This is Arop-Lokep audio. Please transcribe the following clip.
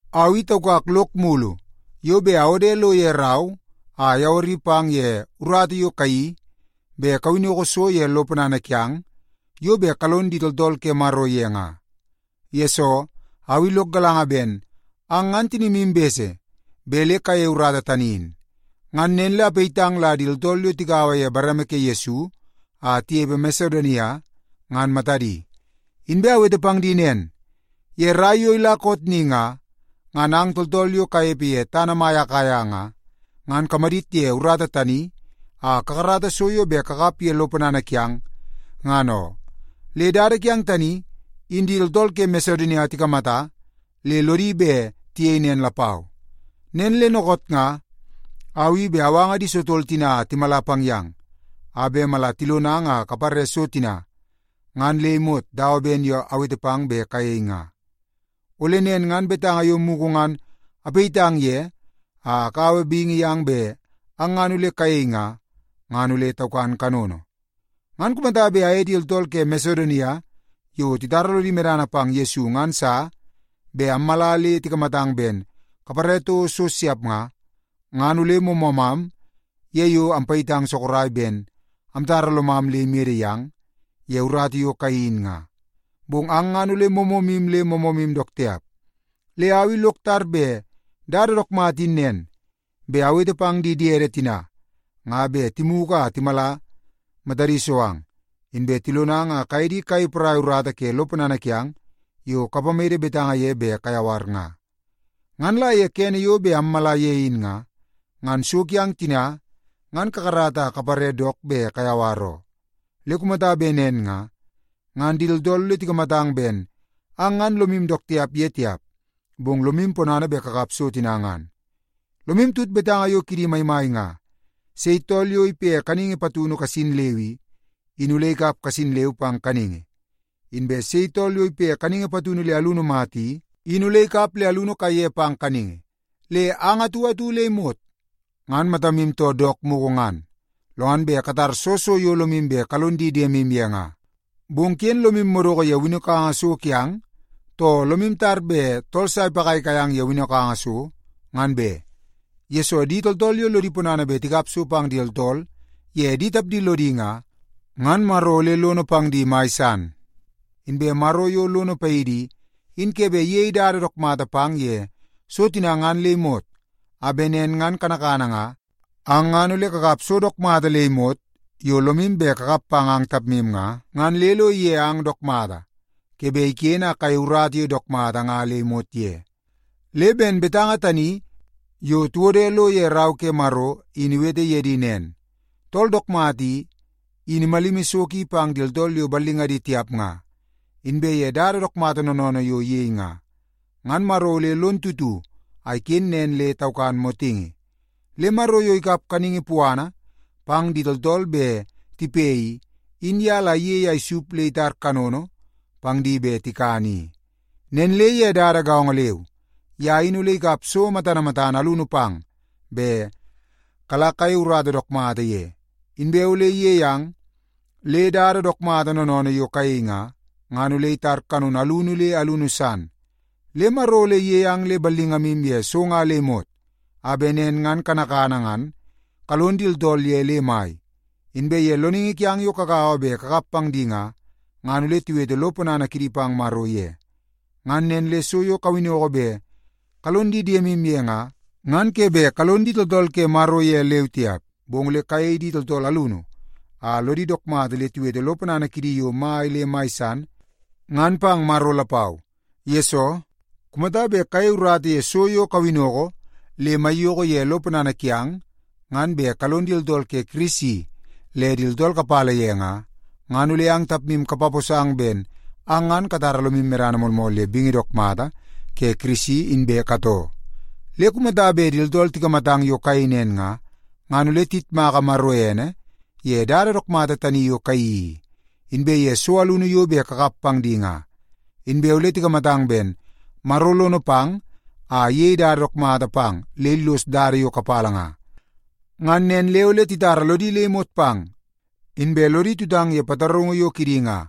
Au i taukak lok mulu yo bet awode lo ye rau a ayawari pang ye urata yo kayeii bet kawinnoko so ye lo ponana kiang yo bet kalon di tooltool ke Maro ye nga. Yesoo, au i lok galanga ben ang ngan tinimu bese bet le kayeie urata tani in. Ngan nen le apayitang la di tooltool yo tigaua ye bareme ke Yesu a tinepe Masedonia ngan matadi. Inbe awete pang di nen, ye rai yo ila koot ni nga, ngan ang tooltool yo kanepe ye tana mai Akaia nga, ngan kamadit ye urata tani a kakarata so yo bet kakap ye lo ponana kiang, ngan oo. Le dada kiang tani, in di tooltool ke Masedonia tikamata le lodi bet tiyei nen lapau. Nen le dookoot nga au i bet awanga di sotol tina a timala pang yang, a bet mala tilonang a kapare so tina ngan le imot dawa ben yo awete pang bet kayei nga. Ole nen ngan betanga yo mugu ngan apayitang ye a akaua bingi yang bet ang ngan ole kayei nga, ngan ole taukan kanono. Ngan kumata bet aye di tooltool ke Masedonia yo titara lodi medana pang Yesu ngan sa bet ammala le tikamatang ben kapare toko so siap nga, ngan ole moomoomam ye yo ampayitang sorok ben amtara lomam le imede yang ye urata yo kayeii in nga. Bong ang ngan ole moomoomu le moomoomu dook tiap. Le au i lok tar bet dada dook mata in nen, bet awete pang di diede tina nga bet timugu a timala matadi so ang, inbe tilonang a kaye di kayei porai urata ke lo ponana kiang yo kapamede betanga ye bet kayawar nga. Ngan la ye kene yo bet ammala ye in nga, ngan so kiang tina ngan kakarata a kapare dook bet kayawar oo. Le kumata bet nen nga, ngan di tooltool ole tikamatang ben ang ngan lomu dook tiap ye tiap, bong lomu ponana bet kakap so tina ngan. Lomu tut betanga yo kidi maimai nga, “Sei tool yo ipe kaningi patunu kasin leu i, in ole ikap kasin leu pang kaningi. Inbe sei tool yo ipe kaningi patunu le alunu mata i, in ole ikap le alunu kaiye pang kaningi.” Le ang atu atu le imot ngan matamu too dook mugu ngan, lo ngan bet katar soo so yo lomu bet kalong di diemu ye nga. Bong ken lomu madoko ye winnokanga so kiang, too lomu tar bet tool sa ipagaigai ang ye winnokanga so, ngan be, yesoo di tooltool yo lodi ponana bet tikap so pang di tooltool ye di tapdi lodi nga, ngan Maro ole lono pang di mai san. Inbe Maro yo lono paidi i, in ke bet iyei dada dook mata pang ye so tina ngan le imot, a bet nen ngan kanakana nga ang ngan ole kakap so dook mata le imot yo lomu bet kakap pang ang tapmu nga, ngan le lo ige ang dook mata ke bet iken a kayei urata yo dook mata nga le imot ye. Le ben betanga tani yo tiwode lo ye Rau ke Maro in iwete ye di nen, “Tool dook mata i, in imalimi so ki pang di tooltool yo ballingadi tiap nga. Inbe ye dada dook mata noonoonoo yo iyei nga, ngan Maro ole lon tutu a iken nen le taukan motingi.” Le Maro yo ikap kaningi puana pang di tooltool bet tipe i, in ye la iyei a isup le itar kanono pang di bet tikan i. Nen le ye dada gaongo leu, ye in ole ikap so matana matana alunu pang bet kala kayei urata dook mata ye, inbe ole iyei ang le dada dook mata noonoonoo yo kayei nga, ngan ole itar kanono alunu le alunu san. Le Maro ole iyei ang le ballingamu ye so nga le imot, a bet nen ngan kanakana ngan kalon di tooltool ye le mai. Inbe ye loningi kiang yo kagaua bet amkap pang di nga, ngan ole tiwete lo ponana kidi pang Maro ye. Ngan nen le so yo kawinnoko bet kalon di diemu ye nga, ngan ke bet kalon di tooltool ke Maro ye leu tiap, bong ole kayei di tooltool alunu a lodi dook mata le tiwete lo ponana kidi yo mai le mai san ngan pang Maro lapau. Yesoo, kumata bet kayei urata ye so yo kawinnoko le maiyoko ye lo ponana kiang ngan bet kalon di tooltool ke Kirisi le tooltool kapala ye nga, ngan ole ang tapmu kapaposang ben ang ngan katara lomu medana moolmool ye bingi dook mata ke Kirisi inbe katoo. Le kumata bet di tooltool tikamatang yo kayei nen nga, ngan ole tiyitmaka Maro ene ye dada dook mata tani yo kayeii i, inbe ye so alunu yo bet kakap pang di nga. Inbe ole tikamatang ben Maro lono pang a iyei dada dook mata pang le illos dada yo kapala nga. Ngan nen le ole titara lodi le imot pang, inbe lodi tutang ye pataraungu yo kidi nga.